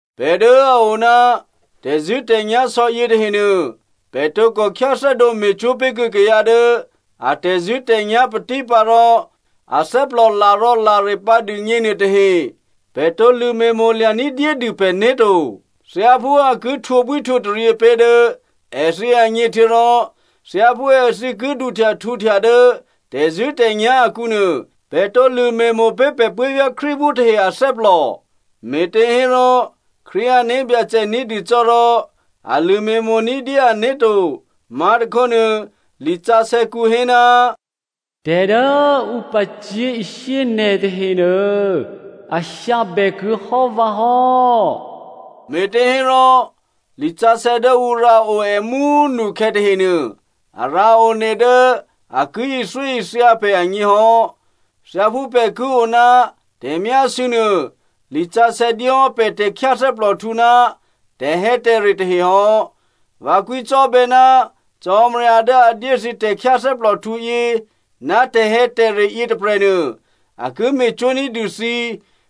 Pè̤ dố a o ná tè̤zṳ̂́tè̤nyá̤ sò̌ yětahenuô, pè̤ tǒkò khyáthè́dǒ me̤cwó̤ pé̤kuô̌ kayǎ dố a tè̤zṳ̂́tè̤nyá̤ patípǎ rò athè́plò larò̌lare pǎ dûgně nuôtahe. Pè̤ tǒ lṳ̂me̤mo̤ lya̤ ní̤dyédû pè̤né̤ to. Thyáphú a ki htwǒbwíhtwǒtaryě pé̤ dố èthǐ agně, htuô̌rò thyáphú èthǐ ki duhtya htǔhtya dố tè̤zṳ̂́tè̤nyá̤ akǔnuô, pè̤ tǒ lṳ̂me̤mo̤ pé̤ pè̤ puố̤vyá̤ Krístuphú tahe athè́plò. Me̤těhérò, Krístu ané̤byacè ní̤dû cò́ rò a lṳ̂me̤mo̤ ní̤dyé ané̤ to. Má̤tôkhónuô, lisǎsè̌kǔ hé, “Tè̤ dố ǔ pacyé̤ishyé nè̤ tahenuô, a hyǎbè kuô̌hò́ vǎ hò́.” Me̤těhérò, lisǎsè̌ dố ǔ rǎo è mú꤮ nukhè̌ tahenuô, a rǎ one dố a ki ithyóithya pè̤ agněhò́. Thyáphú pè̤ ki o ná tè̤myásû̌ nuô, lisǎsè̌ dyé hò́ pè̤ tè̤khyáthè́plòhtǔ ná tè̤hè̌tè̤re tahe hò́. Vǎ kwǐcò́bè̌ ná Cò́marya dố a dyé thǐ tè̤khyáthè́plòhtǔ yě ná tè̤hè̌tè̤re yětôprè̤nuô, a ki me̤cwó̤ ní̤dû thǐ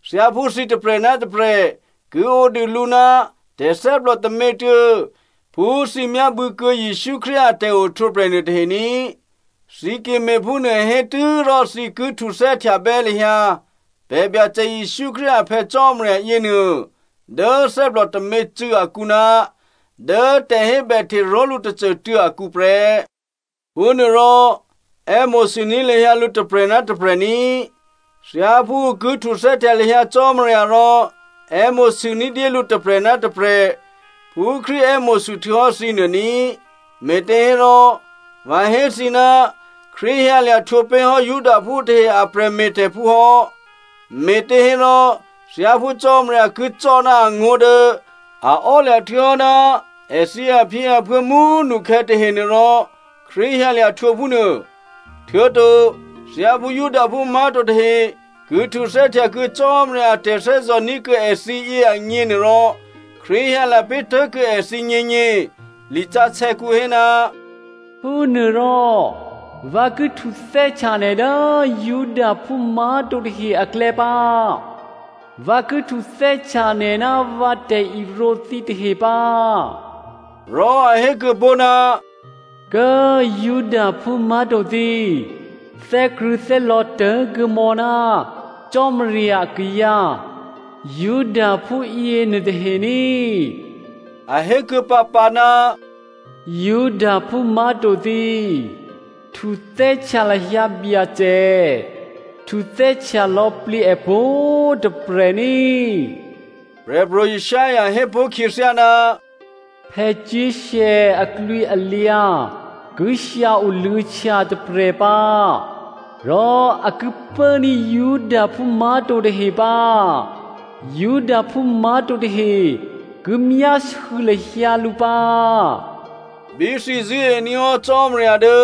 thyáphú thǐ tôprè̤ ná tôprè̤ ki odû lǔ ná tè̤thè́plò tômětuô̌ phú thǐ myábû̌kuô̌ Jesǔ Krístu a tè̤ohtwǒprè̤ nuôtahe ní꤮. Thǐ ki me̤phúnuô hé tû́rò thǐ ki htuthè́htya bè́ lahyǎ pè̤ Byacè Jesǔ Krístu a Phè̌ Cò́marya yěnuô dố thè́plò tômě꤮ cû̌ akǔ ná dố tè̤hébèhte ró̤lǔ tôcô꤮ tuô̌ akǔ prè́. Phúnuôrò è́mo̤sûní̤ lahyǎ lǔ tôprè̤ ná tôprè̤ ní꤮. Thyáphú ǔ ki htuthè́htya lahyǎ Cò́marya rò è́mo̤sû ní̤dyé lǔ tôprè̤ ná tôprè̤ phú Krístu è́mo̤sû htuô̌hò́ thǐnuô ní꤮. Me̤těhérò, vǎ hé thǐ ná Krístu hyǎlya̤ htwǒ pé̤hò́ Judaphú tahe a prè̤me̤tè̤phú hò́, me̤těhérò thyáphú Cò́marya ki cò́ ná angó̤ dố a ò́lya̤ htuô̌hò́ ná èthǐ aphyěaphuô̌ mú꤮ nukhè̌ tahenuôrò Krístu hyǎlya̤ htwǒ phúnuô. Htuô̌to, thyáphú Judaphú má̤to tahe ki htuthè́htya kuô̌ Cò́marya a tè̤thè́zò̤ ní̤kuô̌ èthǐ yě agněnuôrò, Krístu hyǎlya̤ pé̤ tuố̤kuô̌ èthǐgněgně. Lisǎsè̌kǔ hé, “Phúnuôrò, vǎ ki htuthè́htya nè̤ dố Judaphú má̤to tahe aklè̌ pǎ, vǎ ki htuthè́htya nè̤ ná vǎ tè̤irǒ thǐtahe pǎ.” Rò a hé kuô̌pó̤, “Kố꤮ Judaphú má̤to thǐ, thè́krṳ̂̌thè́lò̌ tố̤kuô̌mò̌ ná Cò́marya kayǎ Judaphú yěnuôtahe ní꤮.” A hé kuô̌pǎpǎ, “Judaphú má̤to thǐ꤮, htuthè́htya lahyǎ Byacè, htuthè́htya lò̌plǐ è pwǒ̤꤮ tôprè̤ ní꤮.” Prè̤pro̤ Isaiah hé pó̤ khyěthyá, “Jesse aklwǐalyǎ ki hyǎ oluô̌htya tôprè̤ pǎ, rò a ki pốní̤ Judaphú má̤to tahe pǎ. Judaphú má̤to tahe ki myásû̌ lahyǎ lǔ pǎ.” Bí thǐ zṳ̂́ení̤ hò́ Cò́marya dố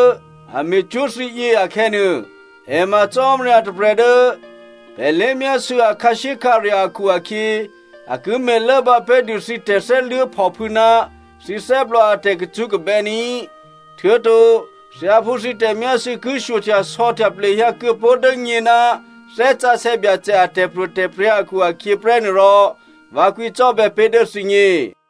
a me̤cwó̤ thǐ yě akhè̌nuô, è ma Cò́marya tôprè̤ dố pè̤ lé̤myásû̌ a khǎshyékhǎrya̤ akhu-akhyě, a ki me̤lốbǎ pé̤dû thǐ tè̤thè́luố̤phòphû̌ ná thǐ thè́plò a tè̤kacṳ́kabè́ ní꤮. Htuô̌to thyáphú thǐ tè̤myásû̌ ki shyohtyasò̌htya plehyǎ kuô̌pó̤ dố nyě ná Thè́ Sǎsè̌ Byacè a tè̤pro̤tè̤prya̤ akhu-akhyě prè́ nuôrò vǎ kwǐcò́bè̌ pé̤ dố thǐgně.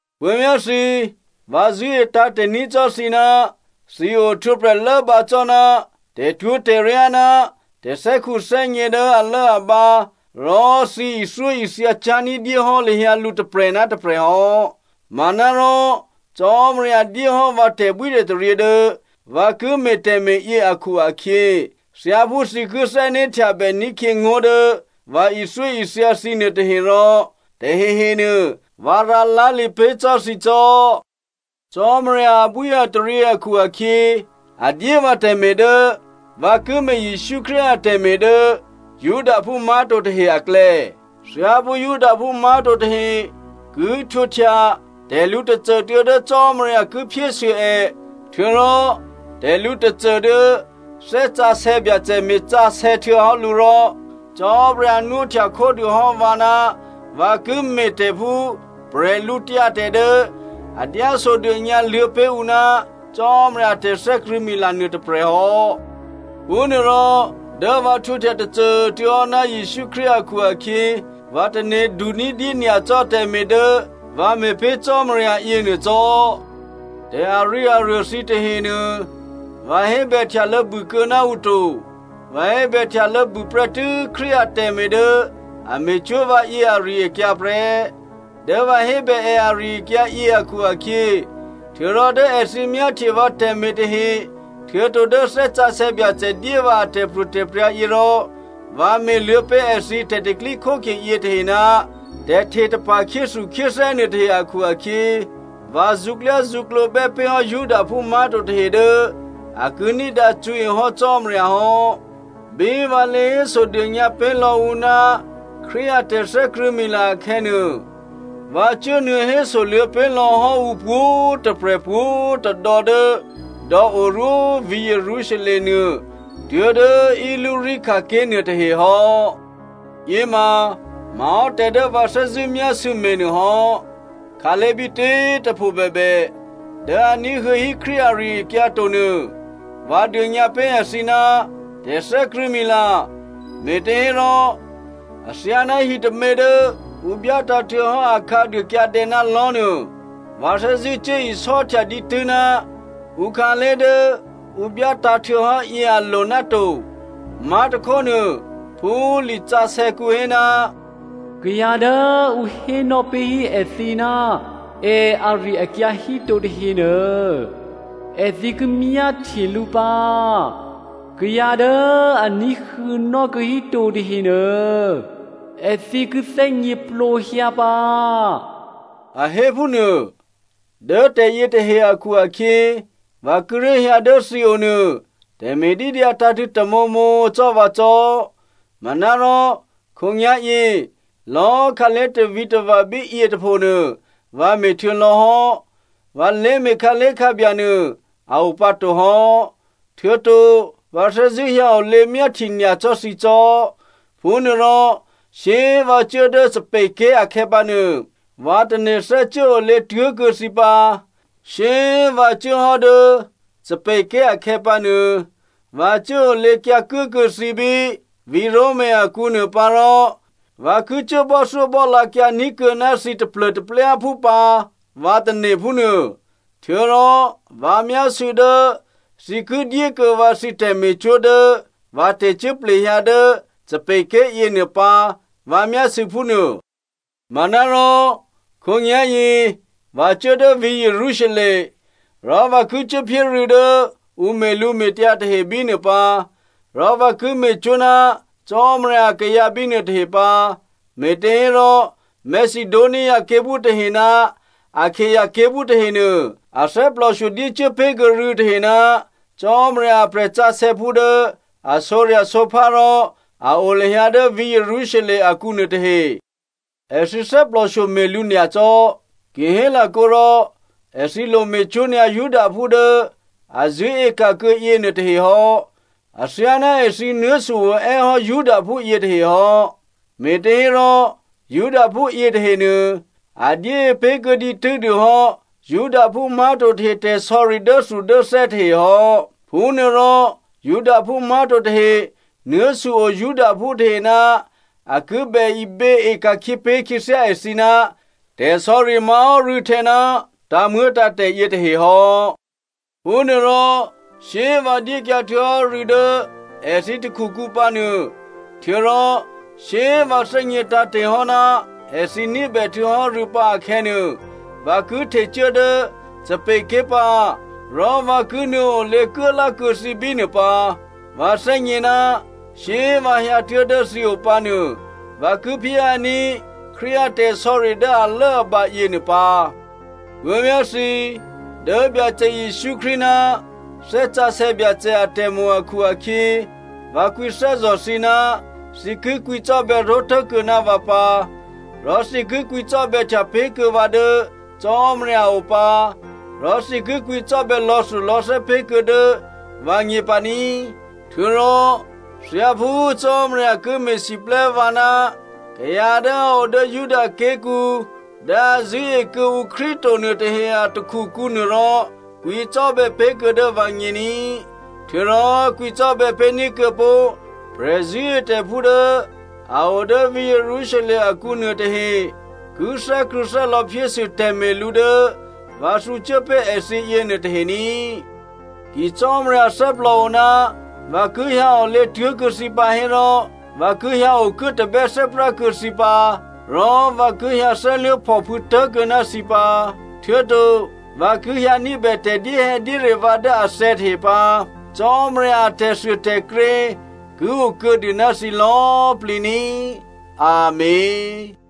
Puố̤vyá̤ thǐ꤮, vǎ zṳ̂́e tǎ̤te̤ ní̤ cò́ thǐ ná thǐ ohtwǒprè̤ lốbǎ cò́ ná tè̤twó̤tè̤ryá, ná tè̤thè́khuthè́gně dố alốabǎ, rò thǐ ithyóithya cyá̤ ní̤dyé hò́ lahyǎ lǔ tôprè̤ ná tôprè̤ hò́. Manárò, Cò́marya dyé hò́ vǎ tè̤bwítè̤taryě dố vǎ ki me̤ tè̤me̤yě akhu-akhyě, thyáphú thǐ ki thè́né̤htyabè ní̤khyě ngó̤ dố vǎ ithyóithya thǐ nuôtahe rò, tahehenuô vǎ rǎlá̤lǐ pé̤ cò́ thǐ cò́. Cò́marya abwíataryě akhu-akhyě a dyé vǎ tè̤me̤ dố vǎ ki me̤ Jesǔ Krístu atè̤me̤ dố Judaphú má̤to tahe aklè̌. Thyáphú Judaphú má̤to tahe ki htwǒhtya tè̤lǔ tôcô dố Cò́marya ki phyésû è, htuô̌rò tè̤lǔ tôcô dố Thè́ Sǎsè̌ Byacè me̤sǎsè̌ htuô̌hò́ lǔ rò, Cò́marya nwóhtya khódûhò́ vǎ ná vǎ ki me̤tè̤ phú bwídu dố a dyásodônyǎ luô̌pé̤ ǔ ná Cò́marya a tè̤thè́krṳ̂̌mila nuôtôprè̤ hò́. Phúnuôrò, dố vǎ htwǒhtya tôcô꤮ tuô̌hò́ ná Jesǔ Krístu hò́ akhu-akhyě, vǎ tane̤du ní̤dyé nyacò́ tè̤me̤ dố vǎ me̤pé̤ Cò́marya yěnuô cò́. Tè̤ arǐaruô thǐ tahenuô vǎ hébèhtyalô̌ bûkuô̌ ná ǔ to. Vǎ hébèhtyalô̌ bûprè́tû́ Krístu atè̤me̤ dố a me̤cwó̤ vǎyě ari-akyǎ prè́. Dố vǎ hébè è ari-akyǎ yě akhu-akhyě, htuô̌rò dố èthǐ myáhtye vǎ tè̤me̤ tahe, htuô̌to dố Thè́ Sǎsè̌ Byacè dyé vǎ atè̤pro̤tè̤prya̤yě rò, vǎ me̤ luô̌pé̤ èthǐ tè̤pro̤tè̤prya̤ yětahe ná tè̤htetapa̤ khyéthukhyéthè́ nuôtahe akhu-akhyě vǎ zṳ̌klyázṳ̌klǒ bè́pé̤hò́ Judaphú má̤to tahe dố a ki ní̤dǎ cṳ̌ehò́ Cò́marya hò́. Bí vǎ lě hésodônyǎ pé̤lò̌ ǔ ná Krístu a tè̤thè́krṳ̂̌mila akhè̌nuô, vǎ cuốnuô̌ hésoluô̌ pé̤ lò̌hò́ ǔ pwǒ̤꤮ tôprè̤, pwǒ̤tôdò̌ dố dò̌o rwó vǐ̤ Jerusalem nuô tuố̤dố Illyricum ké̤ nuôtahe hò́. Yěma má̤hò́ tè̤ dố vǎ thè́zṳ̂́ myásû̌ me̤ nuôhò́. Khǎlé̤ bítě꤮ tôpho bèbè dố a ní̤huô̌hí Krístu ari-akyǎ to nuô vǎ dônyǎpé̤ èthǐ ná tè̤thè́krṳ̂̌mila, me̤těhérò athyáná hitômě dố ǔ byátǎ̤ htuô̌hò́ akhǎduô kyǎdè̌ ná lò̤́nuô, vǎ thè́zṳ̂́ cuố isò́htya dǐtû́ ná ǔkhǎlé̤ dố ǔ byátǎ̤ htuô̌hò́ yě a lo náto. Má̤tôkhónuô, phú lisǎsè̌kǔ hé, “Kayǎ dố ǔ hénò́ pé̤hí èthǐ ná è ari-akyǎ híto tahenuô, èthǐ ki myáhtye lǔ pǎ, kayǎ dố a ní̤huô̌nò́ kuô̌ híto tahenuô èthǐ ki thè́gněplǒhyǎ pǎ,” a hé phúnuô. Dố tè̤yětahe akhu-akhyě, vǎ kíré̤ hyǎ dố thǐo nuô tè̤me̤ dídyǎ tǎ̤tṳ̂̌ tamǒmǒ cò́ vǎ cò́. Manárò, khǒnyá̤yě, lò̌꤮ khǎlé̤ tavǐtava̤ bíyě tôphonuô, vǎ me̤htuô̌ lò̌hò́, vǎ lé̤me̤ khǎlé̤khǎbya nuô a o pǎtohò́. Htuô̌to vǎ thè́zṳ̂́ hyǎ olě myáhtye nyacò́ thǐ cò́. Phúnuôrò shyé꤮ vǎ cuố dố Spain ké̤ akhè̌pǎnuô, vǎ tane̤ thè́cuốolě tuố̤kuô̌ thǐ pǎ. Shyé꤮ vǎ cuố hò́ dố Spain ké̤ akhè̌pǎnuô vǎ cuốolěkyǎ kuốkuô̌ thǐ bí vǐ̤ Roma akǔ nuô pǎ rò vǎ ki cuố bò́thyóbò́lǎkyǎ ní̤kuô̌ ná thǐ taplô̤taplyáphú pǎ vǎ tane̤ phúnuô. Htuô̌rò vǎ myásû̌ dố thǐ ki dyékuô̌ vǎ thǐ tè̤me̤cwó̤ dố vǎ tè̤cuố plehyǎ dố Spain ké̤ yěnuô pǎ, vǎ myásû̌ phúnuô. Manárò, khǒnyá̤yě vǎ cuố dố vǐ̤ Jerusalem. Rò vǎ ki cuốphyé rû̌ dố ǔ me̤lǔme̤tyǎ tahe bínuô pǎ, rò vǎ ki me̤cwó̤ ná Cò́marya akayǎ bínuô tahe pǎ. Me̤těhérò, Macedonia ké̤phú tahe ná Akaia ké̤phú tahenuô, a thè́plòshyo dyécuố pé̤kuô̌ rû̌tahe ná Cò́marya a prè̤sǎsè̌phú dố a sǒrya̤sǒphá rò a o lahyǎ dố vǐ̤ Jerusalem akǔ nuôtahe. Èthǐ thè́plòshyo me̤lǔ nyacò́. Ki hélakǒ rò, èthǐ lome̤cwó̤ nyǎ Judaphú dố a zṳ̂́e ka̤kuô̌ yěnuôtahe hò́. Athyáná èthǐ nuố̤su oè́ hò́ Judaphú yětahe hò́. Me̤těhérò Judaphú yětahenuô a dyée pé̤kuô̌ dǐtû́dû hò́ Judaphú má̤to tahe tè̤sò̌ri dốthudốthè́ tahe hò́. Phúnuôrò Judaphú má̤to tahe nuố̤su o Judaphú tahe ná a ki bè iběe ka̤khyě pé̤ khyěthyá èthǐ ná tè̤sò̌ri má̤hò́ rû̌htè̌ ná tǎ̤muô̌tǎ̤tè̤ yětahe hò́. Phúnuôrò shyé꤮ vǎ dyékyǎ htuô̌hò́ rû̌ dố èthǐ takhukǔ pǎnuô, htuô̌rò shyé꤮ vǎ thè́gně tǎ̤te̤hò́ ná èthǐ ní̤bè htuô̌hò́ rû̌ pǎ akhè̌nuô, vǎ ki htecuố dố Spain ké̤ pǎ, rò vǎ ki nuô̌ olě kuốlákuô̌ thǐ bínuô pǎ. Vǎ thè́gně ná shyé꤮ vǎ hyǎtuố̤ dố thǐ opǎ nuô, vǎ ki phyéhyǎní̤ Krístu a tè̤sò̌ri dố alốabǎ yěnuô pǎ. Puố̤vyá̤ thǐ꤮, dố pè̤ Byacè Jesǔ Krístu ná Thè́ Sǎsè̌ Byacè atè̤mo̤ akhu-akhyě vǎ kwǐthè́zò̤ thǐ ná thǐ ki kwǐcò́bè̌ ró̤tố̤kuô̌ ná vǎ pǎ, rò thǐ ki kwǐcò́bè̌htya pé̤kuô̌ vǎ dố Cò́marya a o pǎ rò thǐ ki kwǐcò́bè̌ lò̌thulò̌thè́ pé̤kuô̌ dố vǎgně pǎ ní꤮. Htuô̌rò, thyáphú Cò́marya ki me̤siplè́ vǎ ná kayǎ dố a o dố Juda ké̤kǔ dố a zṳ̂́e kuô̌ǔ Krístu to nuôtahe a takhukǔ nuôrò, kwǐcò́bè̌ pé̤kuô̌ dố vǎgně ní꤮. Htuô̌rò kwǐcò́bè̌ pé̤ní̤ kuô̌pó̤ prè̤zṳ̂́etè̤phú dố a o dố vǐ̤ Jerusalem akǔ nuôtahe ki thè́krṳ̂̌thè́lò̌ phyésû tè̤me̤lǔ dố vǎ thǔcuố pé̤ èthǐ yěnuôtahe ní꤮. Ki Cò́marya thè́plòo ná vǎ ki hyǎ olě tuố̤kuô̌ thǐ pǎ hérò, vǎ ki hyǎokuố tabè́thè́prá kuô̌ thǐ pǎ, rò vǎ ki hyǎ thè́luố̤phòphû̌ tố̤kuô̌ ná thǐ pǎ. Htuô̌to vǎ ki hyǎ ní̤bè tè̤dyéhè̌dyére vǎ dố athè̌ tahe pǎ. Cò́marya a tè̤thuôtè̤krě ki okuô̌dû ná thǐ lò̌꤮ plǐ ní꤮. Amèn.